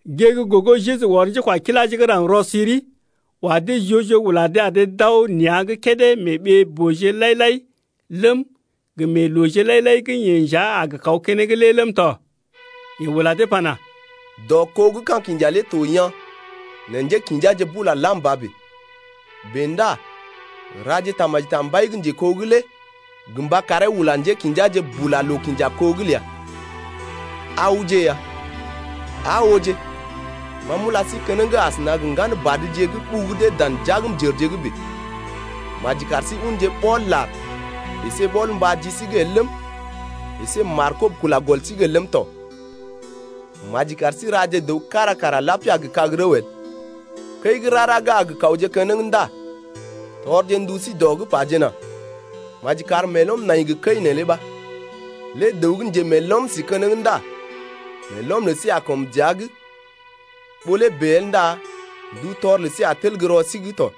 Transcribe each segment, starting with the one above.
Gée gə́ gogo Jeju ɔr njékwakiláje gə́ raŋg rɔ-siri, wa dee joo-joo ula dee ar dee d’aw nea̰’g kédé mee ɓee-booje lai-lai ləm, gə mee looje lai-lai gə́ yeḛ nja a gə kaw keneŋ lé ləm tɔ. Yeḛ ula dee pana: Dɔ kó gə́ ka̰ kinja lé to yaa̰, nɛ njékḭjaje bula lam ba bèe. Bèe ndá raje tamaji ta mbai gə́ njeko’g lé gə mba karee ula njékḭjaje bula loo-kinja-kó’g ləa. Awje ya, aa ooje, ma m’ula sí keneŋ asəna gə ŋgan badje gə́ ɓugu dee dan jagmjərje’g bèe. Maji kar sí unje ɓɔl-lar əsé ɓɔl-mbá ji sí’g el ləm, əsé markob kula gɔl sí’g el ləm tɔ. Maji kar sí raje dəw kára kara lapia gə kag-rəw el. Kəi gə́ rara gə́ a gə kawje keneŋ ndá tɔrje ndu sí dɔ’g pajena: Maji kar meelɔm nai gə kəi neelé ɓa. Lé dəw gə́ njemeelom sí keneŋ ndá meelɔm lə sí a kɔm dəa’g, ɓó lé bèe el ndá ndutɔr lə sí a tel gə́ rɔ sí’g tɔ.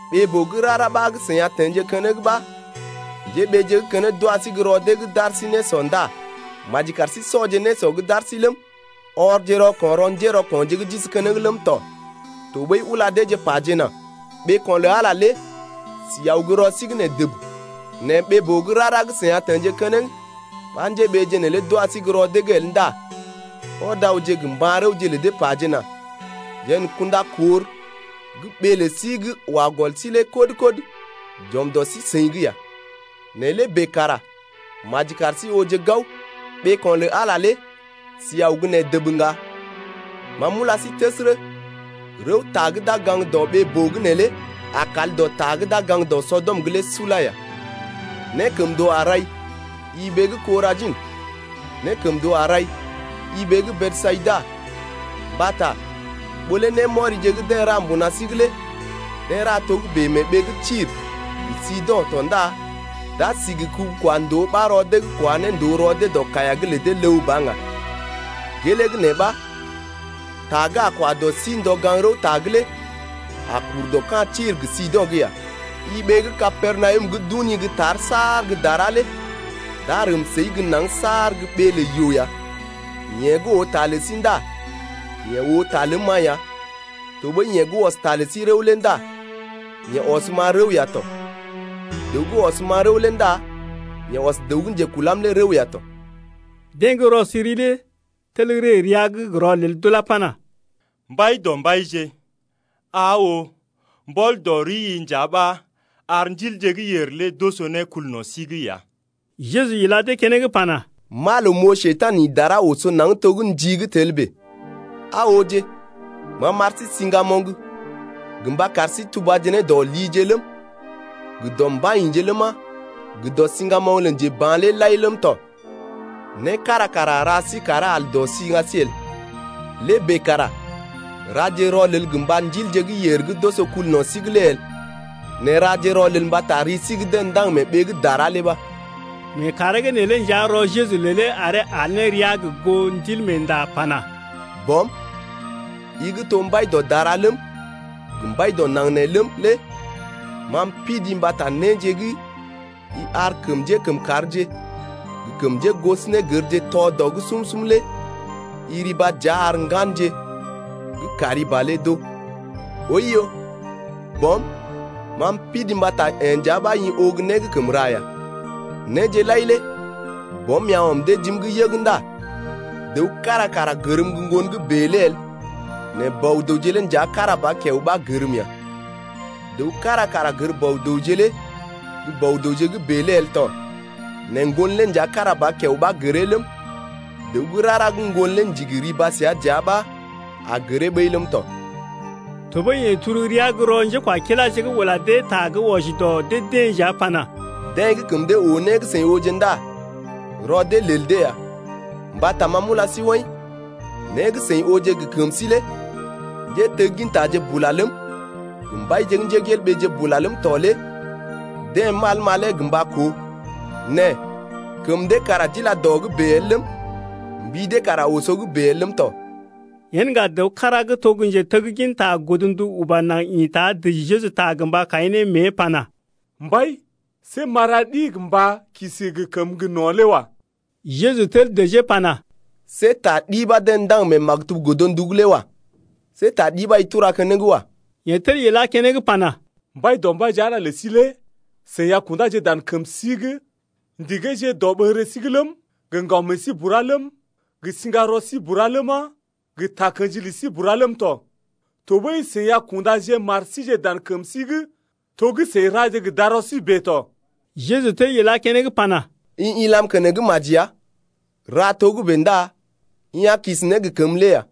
Ɓee-boo gə́ rara ɓa gə́ seḭ a teḛje keneŋ ɓa njéɓeeje gə́ keneŋ d’wa sí gə́ rɔ dee’g d’ar sí nésɔ ndá maji kar sí sɔje nésɔ gə́ d’ar sí ləm, ɔrje rɔko̰ rɔ njérɔko̰je gə́ d’isi keneŋ ləm tɔ. Tɔɓəi ula dee pajena: Ɓeeko̰ lə Ala lé si aw gə́ rɔ sí’g nee dəb. Nɛ ɓee-boo gə́ rara gə́ seḭ a teḛje keneŋ ɓa njéɓeeje neelé d’wa sí gə́ rɔ dee’g el ndá ɔd awje gə mba̰-rəwje’g lə dee pajena: Jeḛ n’kunda kor gə́ ɓee lə sí gə́ wa gɔl sí lé kɔd-kɔd j’ɔm dɔ sí-seḭ’g ya. Nɛ lé bèe kara maji kar sí ooje gao, ɓeeko̰ lə Ala lé si aw gə́ nee dəb ŋga. Ma m’ula sí təsərə, rəwta gə́ d’a gə gaŋg dɔ ɓee-boo’g neelé a kal dɔ ta gə́ gaŋg dɔ Sɔdɔm’g lé sula ya. Nékəmndoo a rai, i ɓee gə́ Korajḭ! Nékəmndoo a rai, i ɓee gə́ Besayida! mbata ɓó lé némɔrije gə́ deḛ ra mbuna sí’g lé deḛ ra togə́bè mee ɓee gə́ Tir gə Sido̰ tɔ ndá d’a si gə kubu-kwa-ndòo ɓa rɔ dee’g kwa ne ndòo rɔ dee dɔ kaiya’g lə dee ləw ba ŋga. Gelee gə́ nee ɓa ta gə́ a kwa dɔ sí ndɔ gaŋg-rəwta’g lé a kur dɔ ka̰ Tir gə Sido̰’g ya. I ɓee gə́ Kapernawum gə́ d’uni gə́ tar saar gə́ dara lé d’a rəm səi gə́ naŋg saar gə́ ɓee lə yoo ya. Yeḛ gə́ oo ta lə sí ndá yeḛ oo ta ləm-ma ya tɔɓəi yeḛ gə́ ɔs sí-seḭ rəw lé ndá yeḛ ɔsm-ma rəw ya tɔ. Dəw gə́ ɔsm-ma rəw lé ndá yeḛ ɔs dəw gə́ njekulam lé rəw ya tɔ. Deḛ gə́ rɔ-siri lé tel ree rəa’g gə rɔlel d’ulá pana, Mbaidɔmbaije, aa oo, mbɔl dɔ rii nja ɓa ar ndilje gə́ yèr lé d’oso ne kul no̰ sí’g ya. Jeju ila dee keneŋ pana: M’aa loo m’oo Njekurai ḭ dara oso naŋg to gə́ ndi gə́ tel bèe. Aa ooje, ma m’ar sí siŋgamoŋ gə mba kar sí tubaje ne dɔ lije ləm, gə dɔ mbai-yḭje ləma, gə dɔ siŋgamoŋ lə njeba̰ bura ləm tɔ. Né kára kara a ra sí karee al dɔ siŋga sí el. Lé bèe kara raje rɔlel gə mba ndilje gə́ yèr gə́ d’oso kul no̰ sí’g lé el, nɛ raje rɔlel mbata ri sí gə́ deḛ ndaŋg mee ɓee gə́ dara lé ɓa. Mee kàree’g neelé nja rɔ Jeju lelee aree al ne rəa gə goo Ndilmeenda pana: Bɔm, i gə́ to mbai dɔ dara ləm, gə mbai dɔ naŋg nee ləm lé ma m’pidii mbata néje gə́ i ar kəm njékəmkàrje gə kəm njégosonégərje tɔ dɔ’g sum-sum lé i riba dəa ar ŋganje gə́ kari ba lé d’oo. Oiyo Bɔm, ma m’pidii mbata yee nja ɓa i oo gə́ né gə́ kəm ra ya. Néje lai lé Bɔm ya ɔm dee jim’g yəg ndá dəw kára kara gərm gə́ Ŋgon gə́ bèe lé el nɛ Bɔ-dəwje lé nja kára ba kiao ɓa gərm ya. Dəw kára kara gər Bɔ-dəwje lé gə́ Bɔ-dəwje gə́ bèe lé el to nɛ Ŋgon lé nja kára ba kiao ɓa gəree ləm, dəw gə́ rara gə́ Ŋgon lé ndigi riba səa dəa ɓa a gəree ɓəi ləm tɔ. Tɔɓəi yeḛ turu rəa gə́ rɔ njékwakiláje’g ula dee ta gə́ wɔji dɔ dee-deḛ nja pana: Deḛ gə́ kəm dee oo né gə́ seḭ ooje ndá rɔ dee lel dee ya. Mbata ma m’ula sí woḭ, né gə́ seḭ ooje gə kəm sí lé njéteggintaje bula ləm, gə mbaije bula ləm tɔ lé deḛ mal malee gə mba koo, nɛ kəm dee kara d’ila dɔ’g bèe el ləm, mbi dee kara oso’g bèe el ləm tɔ. Yen ŋga dəw kára gə́ to gə́ njeteggin godndu uba naŋg ḭta dəji Jeju ta gə mba kaḭ ne mée pana: Mbai, see m’a ra ɗi gə mba kisi gə kəməgə́ gə no̰ lé wa. Jeju tel dəjee pana: See ta ɗi ɓa dee ndaŋg mee maktub godndu’g lé wa. See ta ɗi ɓa i tura keneŋ wa. Yeḛ tel ilá keneŋ pana: Mbaidɔmbaije, Ala ləi lé i a kundá dan kəmi’g ndigee dɔɓəŋgəri’g ləm, gə ŋgaw məəi bura ləm, gə sḭgarɔi bura ləma, gə takə̰ji ləi bura ləm tɔ, tɔɓəi i a kunda mari dan kəmi’g to gə́ i ra ne gə darɔi bèe tɔ. Jeju tel ilá keneŋ pana: I ilam keneŋ maji ya, ra togə́bè ndá i a kisi ne gə kəmə lé ya.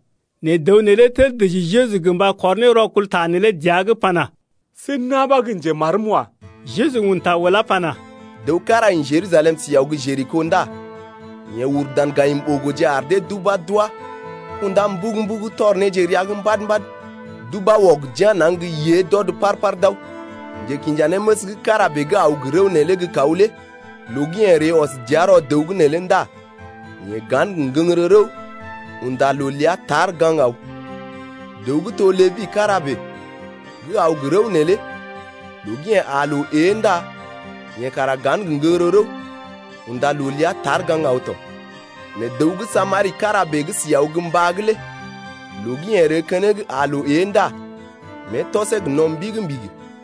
Nɛ dəw neelé tel dəji Jeju gə mba kɔr ne rɔkul ta neelé dəa’g pana: See na̰ ɓa gə́ njemarm wa. Jeju un ta ulá pana: Dəw kára ḭ Jerusalem si aw gə́ Jeriko ndá yeḛ uru dan gayim-ɓogoje ar dee d’ubá d’wá kundá mbugu-mbugu tɔr néje rəa’g mbad-mbad d’ubá wɔg d’yá̰ naŋg gə́ yée d’ɔd par-par d’aw. Njekinjanéməs gə́ kára bèe gə́ aw gə rəw neelé gə́ kaw lé loo gə́ yeḛ ree ɔs dəa rɔ dəw’g neelé ndá yeḛ ga̰ gə ŋgəŋgərə rəw unda loo ləa tar gaŋg aw. Dəw gə́ to Lébi kára bèe gə́ aw gə́ rəw neelé loo gə́ yeḛ aa loo ée ndá yeḛ kara ga̰ gə ŋgəŋgərə rəw unda loo ləa tar gaŋg aw tɔ. Nɛ dəw gə́ Samari kára bèe gə́ si aw gə́ mbá’g lé loo gə́ yeḛ ree keneŋ aa loo ée ndá mée tɔsee gə no̰ mbigi-mbigi.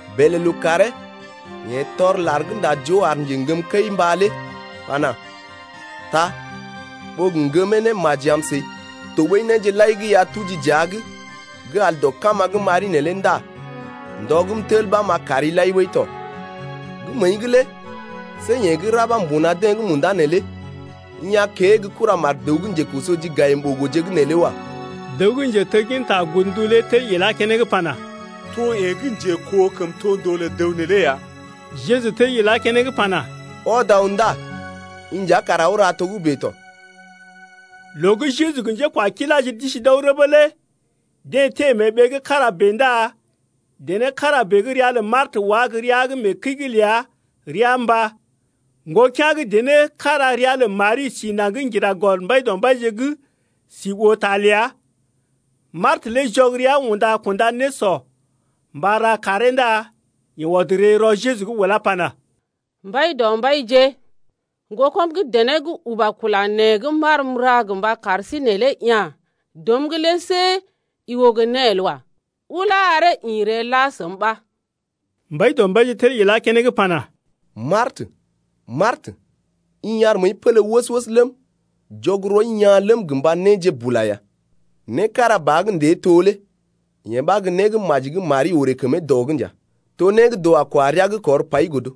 Bèlè lookàree yeḛ tɔr lar gə́ ndá joo ar njeŋgəm kəi-mbá lé pana: Taa ɓó gə ŋgəm ne maji am səi, tɔɓəi néje lai gə́ i a tuji dəa’g gə́ al dɔ kama gə́ m’ari neelé ndá ndɔ gə́ m’tel ɓa m’a kari lai ɓəi tɔ. Gə́ məəi’g lé see yeḛ gə́ ra ɓa mbuna deḛ gə́ munda neelé i a kée gə́ kuramar dəw gə́ njekoso ji gayim-ɓogoje’g neelé wa. Dəw gə́ njetegginta godndu lé tel ilá keneŋ pana: To yeḛ gə́ njekoo kəmtondoo lə dəw neelé ya. Jeju tel ilá keneŋ pana: Ɔd aw ndá i nja kara aw ra togə́bè tɔ. Loo gə́ Jeju gə njékwakiláje d’isi d’aw rəbə lé deḛ teḛ mee ɓee gə́ kára bèe ndá dené kára bèe gə́ ria lə Martə wá gə́ rəa’g mee kəi’g ləa, rəa mbá. Ŋgokea̰ gə́ dené kára ria lə Mari si naŋg ŋgira gɔl Mbaidɔmbaije’g si oo ta ləa. Martə lé jɔg rəa unda kunda nésɔ mba ra karee ndá yeḛ ɔd ree dɔ Jeju’g ulá pana: Mbaidɔmbaije, ŋgokɔm gə́ dené gə́ uba kula nee gə́ m’aar m’ra gə mba kar sí neelé ya̰ dɔm’g lé see i oo gə́ né el wa. Ulá aree ḭ ree la səm ɓa. Mbaidɔmbaije tel ilá keneŋ pana: Martə, Martə, i ar məəi pélé wəs-wəs ləm, jɔg rɔi yaa̰ ləm gə mba néje bula ya. Né kára ba gə́ ndée to lé yee ɓa gə́ né gə́ maji gə́ Mari orè kəmee dɔ’g nja, to né gə́ dəw a kwa rəa’g kɔr pai godo.